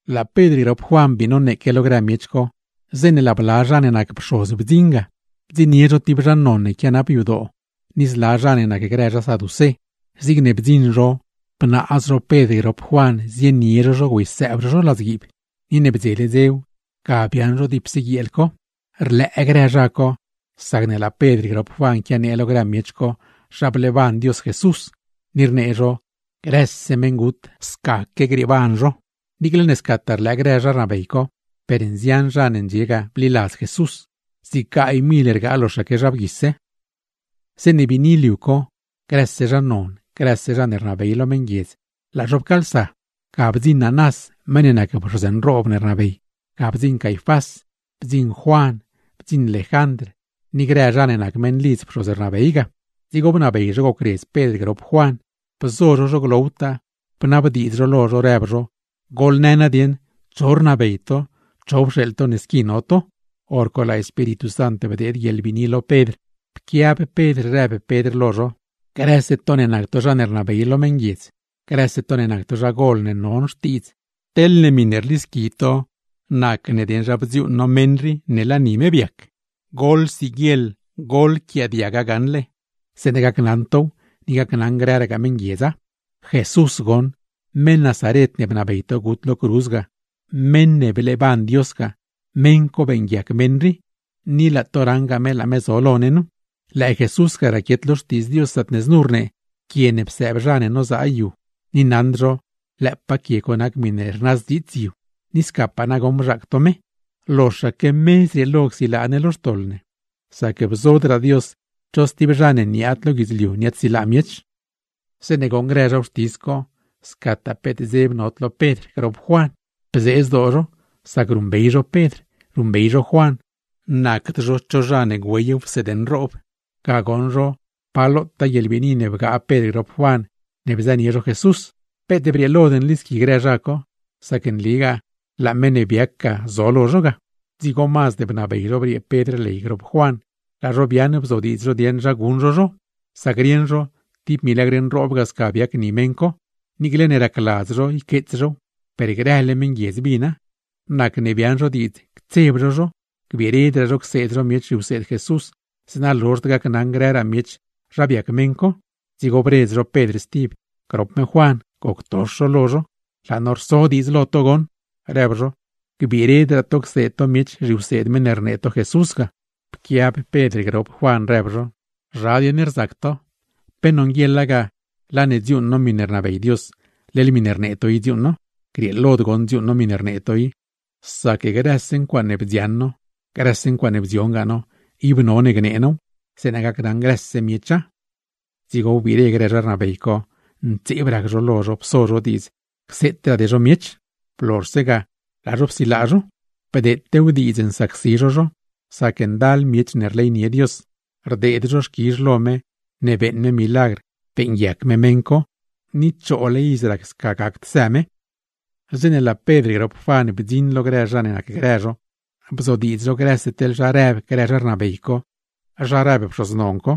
Laa Pedr grop Juan bii noneeque lo grë miech co, zeeṉe laa bla zha ne nac pxoz bdziṉ ga, bdziṉnie zho tib zha non ne quianap yadoo co ni zla zha ne nacgrë zha saducé. Zigne bdziṉ zho bnaaz zho Pedr grop Juan, güeysëëb zho zho ladzguiib; ni ne bdzele dzew, ga biaaṉ zho dipse guieel co. Rlëë grë zha co, sacne laa Pedr grop Juan quianee lo grë miech co zha bleeban Dios Jesús; ni rnee zho grëse meṉgut, scaque grieeban zho. Niicle ne scataa rlëë grë zha rnabey co, per nzian zha ne ndxie ga bliladz Jesús; zig gaay mil rgaa loxaque zha bgui. Zeeṉe biini liu co, grëse zha non, grëse zha ne rnabey lo meṉguiedz, laa zho pcaalsa. Ga bdziṉ Anás meṉ ne nac pxoz nroob ne rnabey, ga bdziṉ Caifás, bdziṉ Juan, bdziṉ Lejandr ni grë zha ne nac meṉlidz pxoz ne rnabey ga. Dzigo bnabey zho gocredz Pedr grop Juan, bzo zho zho glowtaa, bnabdiidz zho lo zho, rëb zho: ―Goḻnë nadieṉ, ¿cho rnabey to, cho pxeeḻ to ne squi no to? Horco laa Espíritu Sant bdeed guieḻbiini lo Pedr, pquiab Pedr rëb Pedr lo zho: ―Grëse to ne nac to zha ne rnabey lo meṉguiedz, grëse to ne nac to zha gol ne non xtiidz. Teḻne miṉe rlisqui to nac ne dieṉ zha bdziuuṉ no meṉ rii ne laa ni me biac, goḻsiguieḻ goḻquiaadiaga gaṉle, zeeṉa gacnaṉ tow ni gacnaṉ grëragaa meṉguiedza. Jesús goṉ, meṉ Nazaret ne bnabey to gut lo cruz ga, meṉ ne bleeban Dios ga, meṉ co beeṉguiac meṉ rii; ni laa to raṉgaa me laa me zo lo ne nu. Lëë Jesús ga raquiet lo Xtiidz Dios zaatne znu rnee: “Quie ne psëëb zha ne nozaa yu, ni naṉd zho lëëpaa quie co nac miṉe rnazdziits yu.” Ni scapaa nagoṉ bzhaac to me. Loxaque me zrieelo csilaa ne lo xtoḻ ne, sac bzodraa Dios cho stib zha ne niaad lo guidzliu niaadsilaa miech. Zeeṉe goṉ grë zha wxtis co, scataa peet dzeb nod lo Pedr grop Juan, bzee zdoo zho; sac ruṉbey zho Pedr, ruṉbey zho Juan, nacd zho cho zha ne güey wseed nroob. Ga goṉ zho, pa lotaa guieḻbiini ne bgaa Pedr grop Juan ne bzënie zho Jesús. Peet brieelod nlisqui grë zha co, sac nligaa laa meṉ ne biac ga zo lo zho ga. Dzigo mazd bnabey zho briee Pedr ley grop me Juan; laa zho biaaṉ bzodiidz zho dieṉ zha guṉ zho zho, sac rieṉ zho tib milagr nroob ga sca biac ni meṉ co; niicle ne racladz zho yqueets zhow, per grële meṉguiedz bina. Nacne biaaṉ zho diidz, ctseb zho zho gbiiredraa zho cseed zho miech zhiwseed Jesús; zeeṉa lozhd gacnaṉ grëraa miech zha biac meṉ co. Dzigo bredz zho Pedr stib, grop me Juan, goctox zho lo zho. ―Laa no rso diidz lo to goṉ ―rëb zho―, gbiiredraa to cseed to miech zhiwseed meṉ ne rnee to Jesús ga. Pquiab Pedr grop Juan, rëb zho: ―Zha dieṉ rzac to, ¿pe nonguieḻa ga laa ne dziuuṉ no miṉe rnabey Dios, leḻ miṉe rnee to i dziuuṉ no? Grieelod goṉ dziuuṉ no miṉe rnee to i, sac grëse ncuaaṉe bdzioṉ no, grëse ncuaaṉe bdziongaa no ib none gnee now, zeeṉa gacnaṉ grëse miecha. Dzigo wbiire grë zha rnabey co, ntseeb rac zho lo zho pso zho diidz cseetraade zho miech; blozhse ga laa zho psilaa zho. Bdeetew diidz nsacsi zho zho, sac ndal miech ne rleynie Dios, rdeed zho xquizh lo me ne beeṉ me milagr beeṉguiac me meṉ co, ni choole iz rac sca gacd së me. Zeeṉe laa Pedr grop Juan bdziṉ lo grë zha ne nacgrë zho, bzodiidz zho grëse teḻ zha rëb grë zha rnabey co, zha rëb pxoz non co.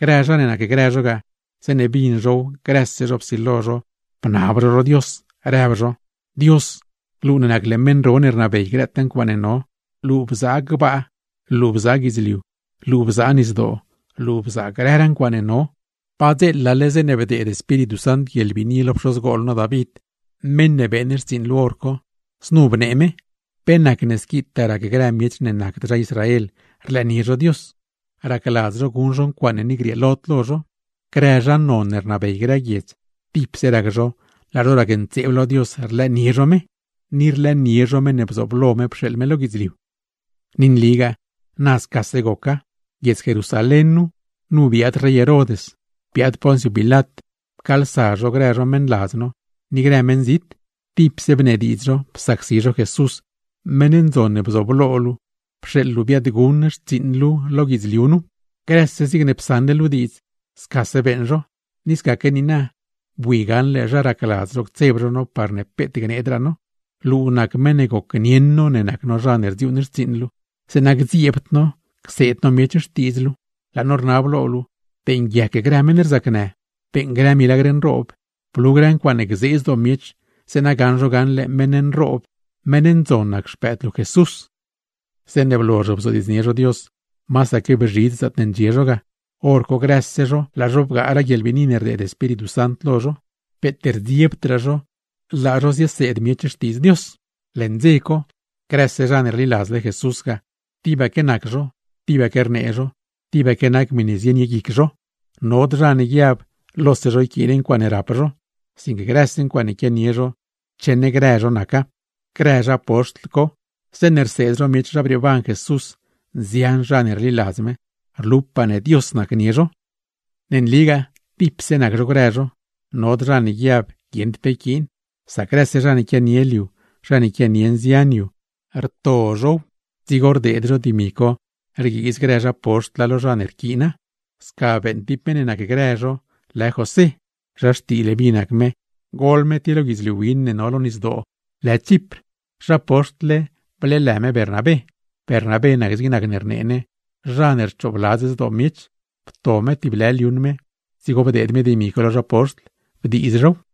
Grë zha ne nacgrë zho ga, zeeṉe bin zhow grëse zho psilo zho bnab zho lo Dios, rëb zho: ―Dios, luu nac meṉ ro ne rnabey grëtaa ncuaaṉe no, luu bzaa gbaa, luu bzaa guidzliu, luu bzaa nisdoo, luu bzaa grëraa ncuaaṉe no. Padzeela zeeṉe bdeed Espíritu Sant guieḻbiini lo pxozgol no David, meṉ ne beeṉ xtsiiṉ luu hor co; znu bnee me: ¿Pe nacne squitaa rac grë miech ne nacd zha Israel rlëënie zho Dios? Racladz zho guṉ zho ncuaaṉe ni grieelod lo zho. Grëse zha non ne rnabey grë guiedz, tipse rac zho laa zho racntseeb lo Dios rlëënie zho me, ni rlëënie zho meṉ ne bzooblo me pxeeḻ me lo guidzliu. ’Ni nligaa na scase goca. Guiedz Jerusalén nu, nu biaad rey Herod, biaad Pons Pilat, pcaalsa zho grë zho meṉladz no ni grë meṉzit, tipse bnediidz zho psacsi zho Jesús, meṉ ndzon ne bzooblo luu pxeeḻ luu biaadguṉ xtsiiṉ luu lo guidzliu nu. Grëse zigne psaṉle luu diidz, scase beeṉ zho. Ni scaque niina, bui gaṉle zha racladz zho ctseb zho no parne peet gneedraa no; luu nac meṉ ne gocnieṉ no ne nac no zha ne rdziuuṉ xtsiiṉ luu, zeeṉa gdzieebd no cseed no miech xtiidz luu. Laa no rnab lo luu, beeṉguiac grë meṉ rzacnë, beeṉ grë milagr nroob, blu grë ncuaaṉe gzee zdoo miech; zeeṉa gaṉ zho gaṉle meṉ nroob, meṉ ndzon nac Xpëëd luu Jesús. Zeeṉe blozh bzodiidznie zho Dios, masaque bzhidz zaatne ndxie zho ga; hor co grëse zho laa zho bgaaraa guieḻbiini ne bdeed Espíritu Sant lo zho; peet rdziebdraa zho laa zho zieseed miech Xtiidz Dios. Leṉ dze co, grëse zha ne rliladzle Jesús ga, tibaque nac zho, tibaque rnee zho, tibaque nac miṉe zienie guic zho. Nod zha ne guiab lose zho yquiin ncuaaṉe rap zho; sinque grëse ncuaaṉe quianie zho cheṉ grë zho naca. Grë zha poxtl co, zeeṉe rseed zho miech zha brieeban Jesús, nzian zha ne rliladz me; rlupaa ne Dios nacnie zho. Ne nligaa tipse nac zho grë zho, nod zha ne guiab ne guieṉd pe yquiin, sac grëse zha ne quianie liu, zha ne quianie nzian yu, rto zhow dzigo rdeed zho dimi co rguiiz grë zha poxtla lo zha ne rquiina. Sca beeṉ tib meṉ ne nacgrë zho lë José. (Zha xtii Leví nac me, gol me tib lo guidzliu win ne no lo nisdoo lë Chipr; zha poxtl-le bleelë me Bernabé. Bernabé, nac zig nac ne rnee ne: Zha ne rchoobladz zdoo miech.) Pto me tib lë liuṉ me, dzigo bdeed me dimi co lo zha poxtl, bdiiz zhow.